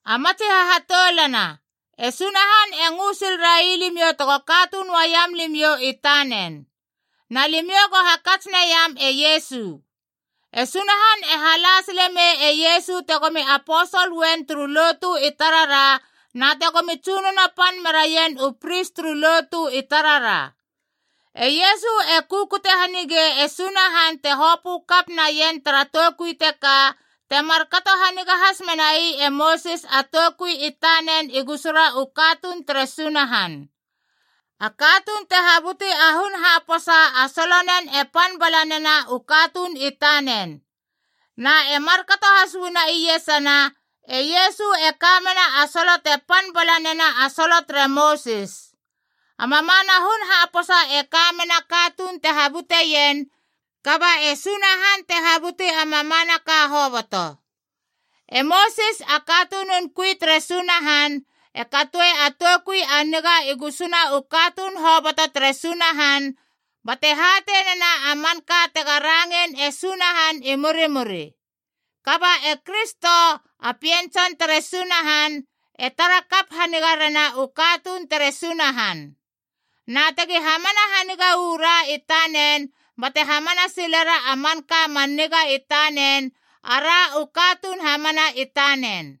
A matsi hahatoulana, e Sunahan e ngö sil railimiou tego katuun uaiam limiou i tanen. Na limiou go hakats naiam e Iesu. E Sunahan e hala sile mei e Iesu tegomi aposol uen turu lotu i tarara na tegomi tsunono pan meraien u pris turu lotu i tarara. E Iesu e kukute hanigei e Sunahan te hopö kap naien tara toukui teka, te markato haniga has menai e Mosis a toukui i tanen i gusuna u katuun tere Sunahan. A katuun te habuti a hun haposa a solonen e pan bala nena u katuun i tanen. Na e markato has uana iesana, e Iesu e ka mena a solo te pan bala nena a solo tere Mosis. A mamana hun haposa e ka mena a katuun te habuteien, kaba e Sunahan te habuti a mamanaka hoboto. E Mosis, a katunun kui tere Sunahan, e katoe a toukui a niga i gusuna u katuun hoboto tere Sunahan, bate hatei nena a manka tega rangein e Sunahan i murimuri. Kaba e Kristo, a Pien Tson tere Sunahan, e tara kap haniga rena u katuun tere Sunahan. Na tegi hamana haniga uu ra i tanen bate hamana silera a manka man niga i tanen, ara u katuun hamana i tanen.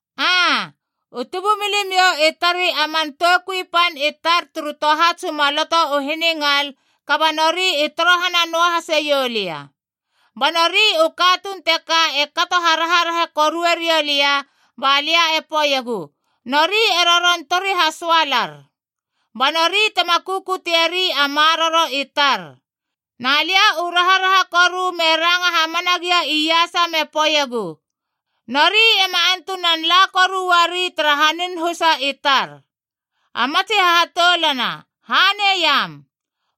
Aa, u tubumilimiou i tarei a man toukui pan i tar turu tohats u maloto u hiningal, kaba nori i torohana noa haseiou lia. Ba nori u katuun teka e kato haraharaha korue riou lia, ba lia e poeiegu, ‘Nori e roron tori hasoalar. Ba nori tema kukutieri a maroro i tar.’ Na lia u raharaha koru me ranga hamana gia iasa me poeiegu, ‘Nori ema antunan la koru uari tara hanin husa i tar.’” A matsi hahatoulana, haneiam.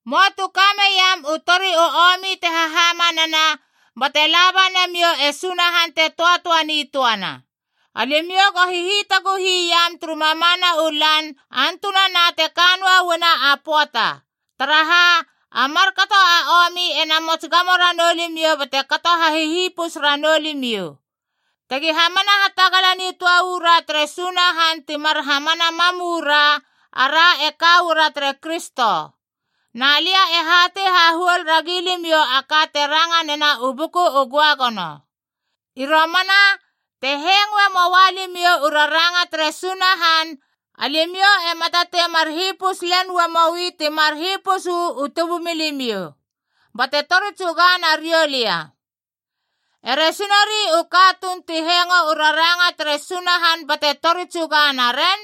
Möa tu ka meiam u tori u omi te hahamanana bate laba namiou e Sunahan te töatöa nitöana. Alimiou go hihitaguhi iam turu mamana u lan antunana te ka noa uana a pöata. Taraha, a markato a omi ena mots gamo ranou limiou bate kato hahihipus ranou limiou. Tegi hamana hatagala nitöa uu ra tere Sunahan ti mar hamana mam uu ra, ara e ka uara tere Kristo. Na lia e hatei hahuol ragi limiou a ka te ranga nena u Buku u Göagono: “I romana, te hengoe moua limiou u raranga tere Sunahan, alimiou ema tatei mar hipus len uamoi timar hipus uu tubumilimiou bate tori tsuga nariou lia.” Eresi nori u katuun ti hengo u raranga tere Sunahan bate tori tsuga naren?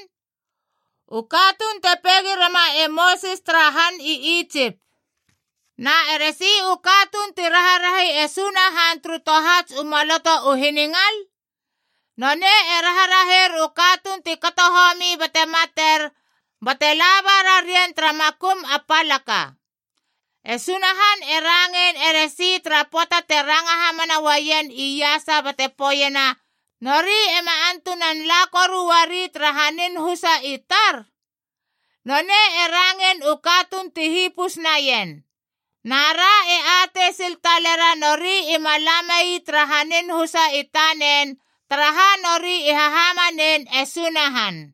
U katuun te peigi rema e Mosis tara han i Itsip. Na eresi u katuun ti raharahi e Sunahan turu tohats u maloto u hiningal? Nonei e raharaher u katuun ti kato homi bate mater, bate laba rarien tara makum a palaka. E Sunahan e rangein eresi tara pöata te ranga hamana uaien iasa bate poeiena, “Nori ema antunan la koru uari tara hanin husa i tar”? Nonei e rangein u katuun ti hipus naien. Na ra e atei sil talera nori ima la mei tara hanin husa i tanen, taraha nori i hahamanein e Sunahan.